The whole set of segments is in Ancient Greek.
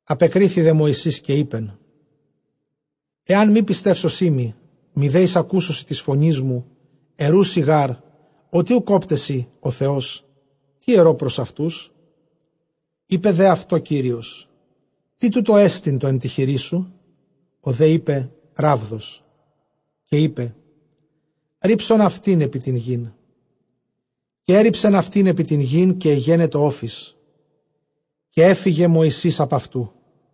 Ἀπεκρίθη δὲ Μωυσῆς, καὶ εἶπεν, ἐὰν μὴ πιστεύσωσί μοι, μηδὲ εἰσακούσωσι τῆς φωνῆς μου, ἐροῦσι γὰρ, ὅτι οὐκ ὦπταί σοι ὁ Θεὸς, τί ἐρῶ πρὸς αὐτούς; Εἶπε δὲ αὐτῳ Κύριος, τί τοῦτό ἐστι τὸ ἐν τῇ χειρί σου; ὁ δὲ εἶπε, ῥάβδος. Καὶ εἶπε, ῥίψον αὐτὴν ἐπὶ τὴν γῆν· καὶ ἔῤῥιψεν αὐτὴν ἐπὶ τὴν γῆν, καὶ ἐγένετο ὄφις· καὶ ἔφυγε Μωυσῆς ἀπʼ αὐτοῦ.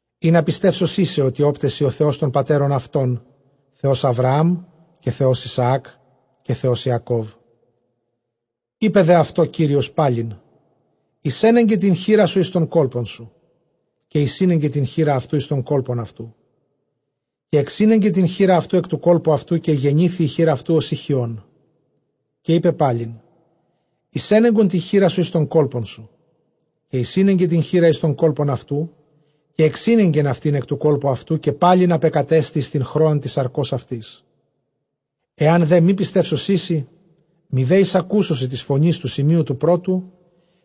Ἵνα πιστεύσωσί σοι, ὅτι ὦπταί σοι ὁ Θεὸς τῶν πατέρων αὐτῶν, Θεὸς Ἀβραὰμ, καὶ Θεὸς Ἰσαὰκ, καὶ Θεὸς Ἰακώβ. Εἶπε δὲ αὐτῷ Κύριος πάλιν, εἰσένεγκον τὴν χεῖρά σου εἰς τὸν κόλπον σου· καὶ εἰσήνεγκε τὴν χεῖρα αὐτοῦ εἰς τὸν κόλπον αὐτοῦ· καὶ ἐξήνεγκεν τὴν χεῖρα αὐτοῦ ἐκ τοῦ κόλπου αὐτοῦ, καὶ ἐγενήθη ἡ χεὶρ αὐτοῦ ὡσεὶ χιών. Καὶ εἶπεν πάλιν, εἰσένεγκον τὴν χεῖρά σου εἰς τὸν κόλπον σου· καὶ εἰσήνεγκε τὴν χεῖρα εἰς τὸν κόλπον αὐτοῦ· καὶ ἐξήνεγκεν αὐτὴν ἐκ τοῦ κόλπου αὐτοῦ, καὶ πάλιν ἀπεκατέστη εἰς τὴν χρόαν τῆς σαρκὸς αὐτῆς. Ἐὰν δὲ μὴ πιστεύσωσί σοι, μηδὲ εἰσακούσωσι τῆς φωνῆς τοῦ σημείου τοῦ πρώτου,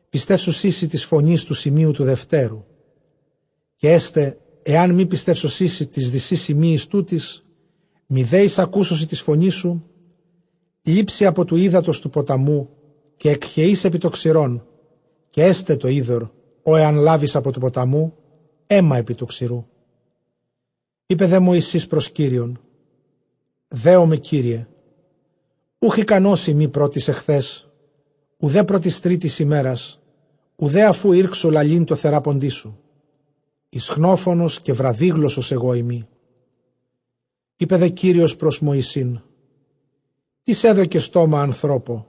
πιστεύσουσί σοι τῆς φωνῆς τοῦ σημείου τοῦ δετέρου. Καὶ ἔσται ἐὰν μὴ πιστεύσωσί σοι τοῖς δυσὶ σημείοις τούτοις, μηδὲ εἰσακούσωσι τῆς φωνῆς σου, λήψῃ ἀπὸ τοῦ ὕδατος τοῦ ποταμοῦ, καὶ ἐκχεεῖς ἐπὶ τὸ ξηρόν· καὶ ἔσται τὸ ὕδωρ, ὃ ἐὰν λάβῃς ἀπὸ τοῦ ποταμοῦ, αἷμα ἐπὶ τοῦ ξηροῦ. Εἶπε δὲ Μωυσῆς πρὸς Κύριον, δέομαι, Κύριε· οὐχ ἱκανός εἰμι πρὸ τῆς χθὲς οὐδὲ πρὸ τῆς τρίτης ἡμέρας, οὐδὲ ἀφʼ οὗ ἤρξω λαλεῖν τῷ θεράποντί σου· ἰσχνόφωνος καὶ βραδύγλωσσος ἐγώ εἰμι. Εἶπε δὲ Κύριος πρὸς Μωυσῆν, τίς ἔδωκε στόμα ἀνθρώπῳ;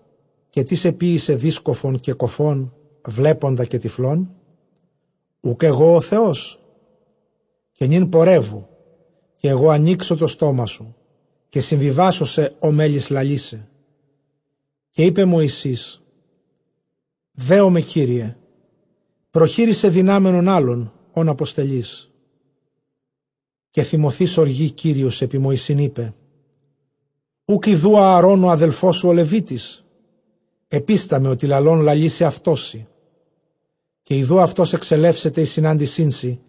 καὶ τίς ἐποιήσε δύσκωφον καὶ κωφὸν, βλέποντα καὶ τυφλόν; οὐκ ἐγὼ ὁ Θεός; Καὶ νῦν πορεύου, καὶ ἐγὼ ἀνοίξω τὸ στόμα σου, καὶ συμβιβάσω σε ὃ μέλλεις λαλῆσαι. Καὶ εἶπε Μωυσῆς, δέομαι, Κύριε· προχείρισαι δυνάμενον ἄλλον, ὃν ἀποστελεῖς. Καὶ θυμωθεὶς ὀργῇ Κύριος ἐπὶ Μωυσῆν, εἶπεν, οὐκ ἰδοὺ Ἀαρὼν ὁ ἄδελφός σου ὁ Λευίτης; ἐπίσταμαι ὅτι λαλῶν λαλήσει αὐτός σοι· καὶ ἰδοὺ αὐτὸς ἐξελεύσεται εἰς συνάντησίν σοι,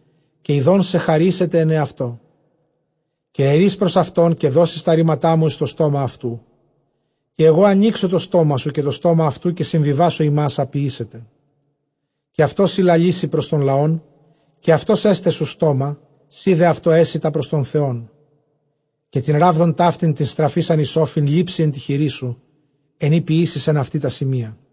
καὶ ἰδών σε χαρήσεται ἐν ἑαυτῷ. Καὶ ἐρεῖς πρὸς αὐτὸν, καὶ δώσεις τὰ ῥήματά μου εἰς τὸ στόμα αὐτοῦ, καὶ ἐγὼ ἀνοίξω τὸ στόμα σου καὶ τὸ στόμα αὐτοῦ, καί συμβιβάσω ὑμᾶς ἃ ποιήσετε. Καὶ αὐτός σοι λαλήσει πρὸς τὸν λαὸν, καὶ αὐτὸς ἔσται σου στόμα· σὺ δὲ αὐτῷ ἔσῃ τὰ πρὸς τὸν Θεόν. Καὶ τὴν ῥάβδον ταύτην, τὴν στραφεῖσαν εἰς ὄφιν, λήψῃ ἐν τῇ χειρί σου, ἐν ᾗ ποιήσεις ἐν αὐτῇ τὰ σημεῖα.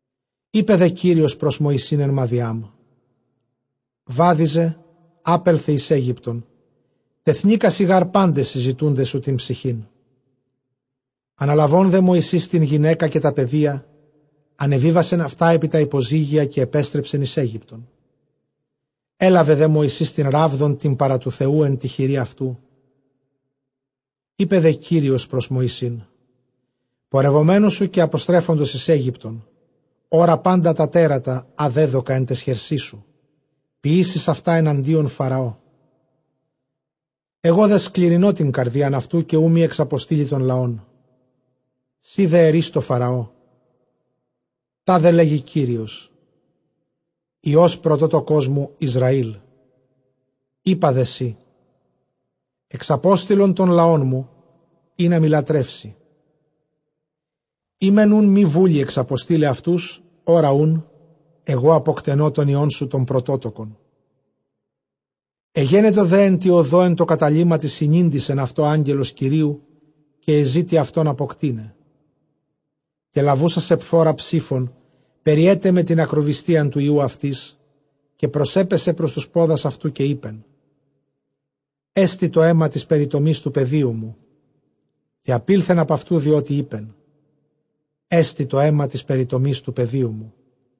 Εἶπε δὲ Κύριος πρὸς Μωυσῆν ἐν Μαδιὰμ, βάδιζε, ἄπελθε εἰς Αἴγυπτον, τεθνήκασι γὰρ πάντες οἱ ζητοῦντες σου τὴν ψυχήν. Ἀναλαβὼν δὲ Μωυσῆς τὴν γυναῖκα καὶ τὰ παιδία, ἀνεβίβασεν αὐτὰ ἐπὶ τὰ ὑποζύγια, καὶ ἐπέστρεψεν εἰς Αἴγυπτον· ἔλαβε δὲ Μωυσῆς τὴν ῥάβδον τὴν παρὰ τοῦ Θεοῦ ἐν τῇ χειρὶ αὐτοῦ. Εἶπε δὲ Κύριος πρὸς Μωυσῆν, πορευομένου σου καὶ ἀποστρέφοντος εἰς Αἴγυπτον, ὅρα πάντα τὰ τέρατα ἃ δέδωκα ἐν ταῖς χερσί σου, ποιήσεις αὐτὰ ἐναντίον Φαραώ· ἐγὼ δὲ σκληρυνῶ τὴν καρδίαν αὐτοῦ, καὶ οὐ μὴ ἐξαποστείλῃ τὸν λαόν. Σὺ δὲ ἐρεῖς τῷ Φαραῴ, τάδε λέγει Κύριος, υἱὸς πρωτότοκός μου Ἰσραήλ. Εἶπα δέ σοι, ἐξαπόστειλον τὸν λαόν μου, ἵνα μοι λατρεύσῃ· εἰ μὲν οὖν μὴ βούλει ἐξαποστεῖλαι αὐτούς, ὅρα οὖν, ἐγὼ ἀποκτένῶ τὸν υἱόν σου τὸν πρωτότοκον. Ἐγένετο δὲ ἐν τῇ ὁδῷ ἐν τῷ καταλύματι συνήντησεν αὐτῷ Ἄγγελος Κυρίου, καὶ ἐζήτει αὐτὸν ἀποκτεῖναι. Καὶ λαβοῦσα Σεπφώρα ψῆφον, περιέτεμε τὴν ἀκροβυστίαν τοῦ υἱοῦ αὐτῆς· καὶ προσέπεσε πρὸς τοὺς πόδας αὐτοῦ, καὶ εἶπεν, ἔστη τὸ αἷμα τῆς περιτομῆς τοῦ παιδίου μου. Καὶ ἀπῆλθεν ἀπʼ αὐτοῦ, διότι εἶπεν, ἔστη τὸ αἷμα τῆς περιτομῆς τοῦ παιδίου μου.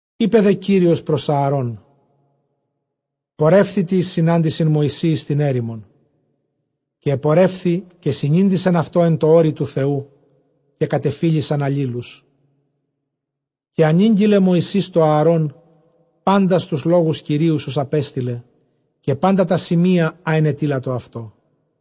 Εἶπε δὲ Κύριος πρὸς Ἀαρὼν, πορεύθητι εἰς συνάντησιν Μωυσῇ εἰς τὴν ἔρημον· καὶ ἐπορεύθη, καὶ συνήντησεν αὐτῷ ἐν τῷ ὄρει τοῦ Θεοῦ, καὶ κατεφίλησαν ἀλλήλους. Καὶ ἀνήγγειλε Μωυσῆς τῷ Ἀαρὼν πάντας τοὺς λόγους Κυρίου, οὓς ἀπέστειλε, καὶ πάντα τὰ ῥήματα, ἃ ἐνετείλατο αὐτῷ.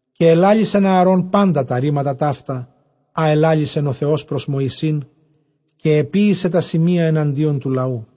Καὶ ἐλάλησεν Ἀαρὼν πάντα τὰ ῥήματα ταῦτα, ἃ ἐλάλησεν ὁ Θεὸς πρὸς Μωυσῆν, καὶ ἐποίησε τὰ σημεῖα ἐναντίον τοῦ λαοῦ.